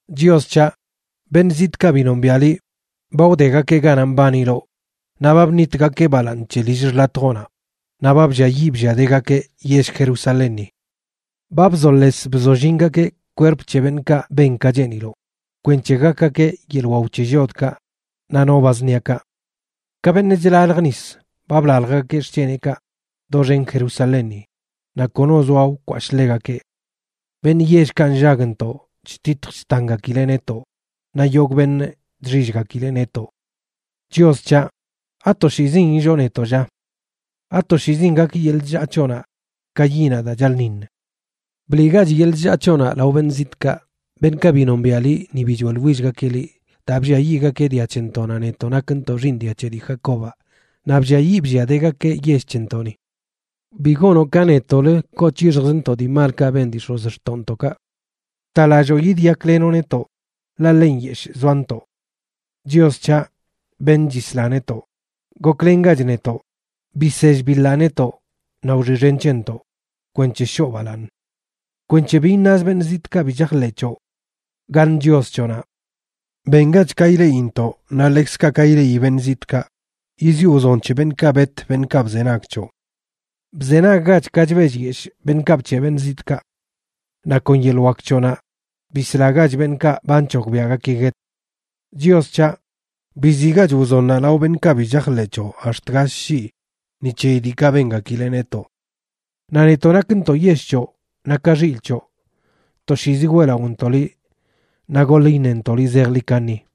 Chios c̱haꞌ, beṉꞌ zitꞌkaꞌ bi nombiaꞌ liꞌ ba wdegakeꞌ ganaꞌ mbaniloꞌ, naꞌ ba bṉitgakeꞌ balaaṉ c̱he lill xḻatjoꞌnaꞌ, naꞌ ba blliayiꞌ blliadegakeꞌ yell Jerusalénni. Ba bzoles bzollingakeꞌ kwerp c̱he beṉꞌkaꞌ ben ka cheeniloꞌ, kwenc̱he gakgakeꞌ yeḻꞌ waw c̱he llodkaꞌ naꞌ no ba zṉiakaꞌ. Ka beṉꞌ chlalj nis, ba blaljgakeꞌ xc̱heneꞌkaꞌ doxen Jerusalénni, naꞌ kono zoa wkwashꞌ ḻegakeꞌ. Beṉꞌ yellkaꞌ nllagntoꞌ chtitj chtangakileꞌ netoꞌ, naꞌ yogꞌ beṉꞌ chxillgakileꞌ netoꞌ. Chios c̱haꞌ, ¿Atoshiizin illoo netoꞌ, lla? ¿Atoshiizin gak yeḻꞌ chllaa c̱hoꞌnaꞌ ka yiꞌnaꞌ daa chaḻꞌṉiṉ? Bliꞌgach yeḻꞌ chllaa c̱hoꞌnaꞌ lao beṉꞌ zitꞌkaꞌ, beṉꞌkaꞌ bi nombiaꞌ liꞌ ni bi choeꞌḻwillgakeꞌ liꞌ, daa blliayiꞌgakeꞌ dia c̱hentoꞌnaꞌ, netoꞌ nakntoꞌ xiiṉ dia c̱he dii Jacobaꞌ, naꞌ blliayiꞌ blliadegakeꞌ yell c̱hentoꞌni. Bi gonoꞌ ka netoꞌlə koo c̱hixjzntoꞌ dii malkaꞌ ben dii x̱ozxtoꞌntoꞌkaꞌ. Btalalloo yidyaklenoꞌ netoꞌ, ḻaꞌ ḻe nyeshꞌ zoantoꞌ. Chios c̱haꞌ, beṉꞌ chisla netoꞌ, goklengach netoꞌ, bisell biḻaꞌ netoꞌ, naꞌ wxiꞌxen c̱hentoꞌ, kwenc̱he shoo balaaṉ. Kwenc̱he bi iṉaz beṉꞌ zitꞌkaꞌ bi chajḻeꞌ c̱hoꞌ: ¿Gaṉ Chios c̱hoꞌnaꞌ?, bengach ka ileꞌintoꞌ, naꞌ ḻekzkaꞌ ka ileꞌi beṉꞌ zitꞌkaꞌ, yiziꞌo wzon c̱he beṉꞌkaꞌ bet beṉꞌkaꞌ bzenag c̱hoꞌ. Bzenaggach ka chbellyeshꞌ beṉꞌkaꞌ bc̱heꞌ beṉꞌ zitꞌkaꞌ. Naꞌ kon yeḻꞌ wak c̱hoꞌnaꞌ bislagach beṉꞌkaꞌ ba nc̱hogbiaꞌgakeꞌ guet. Chios c̱haꞌ, biziꞌgach wzonnaꞌ lao beṉꞌkaꞌ bi chajḻeꞌ c̱hoꞌ ax̱t gall shii ni c̱heyi diikaꞌ bengakileꞌ netoꞌ. Naꞌ netoꞌ nakntoꞌ yell c̱hoꞌ naꞌ ka x̱il c̱hoꞌ, toshiizi weꞌlaꞌontoꞌ liꞌ naꞌ goḻ iṉentoꞌ liꞌ zejḻi kaṉi.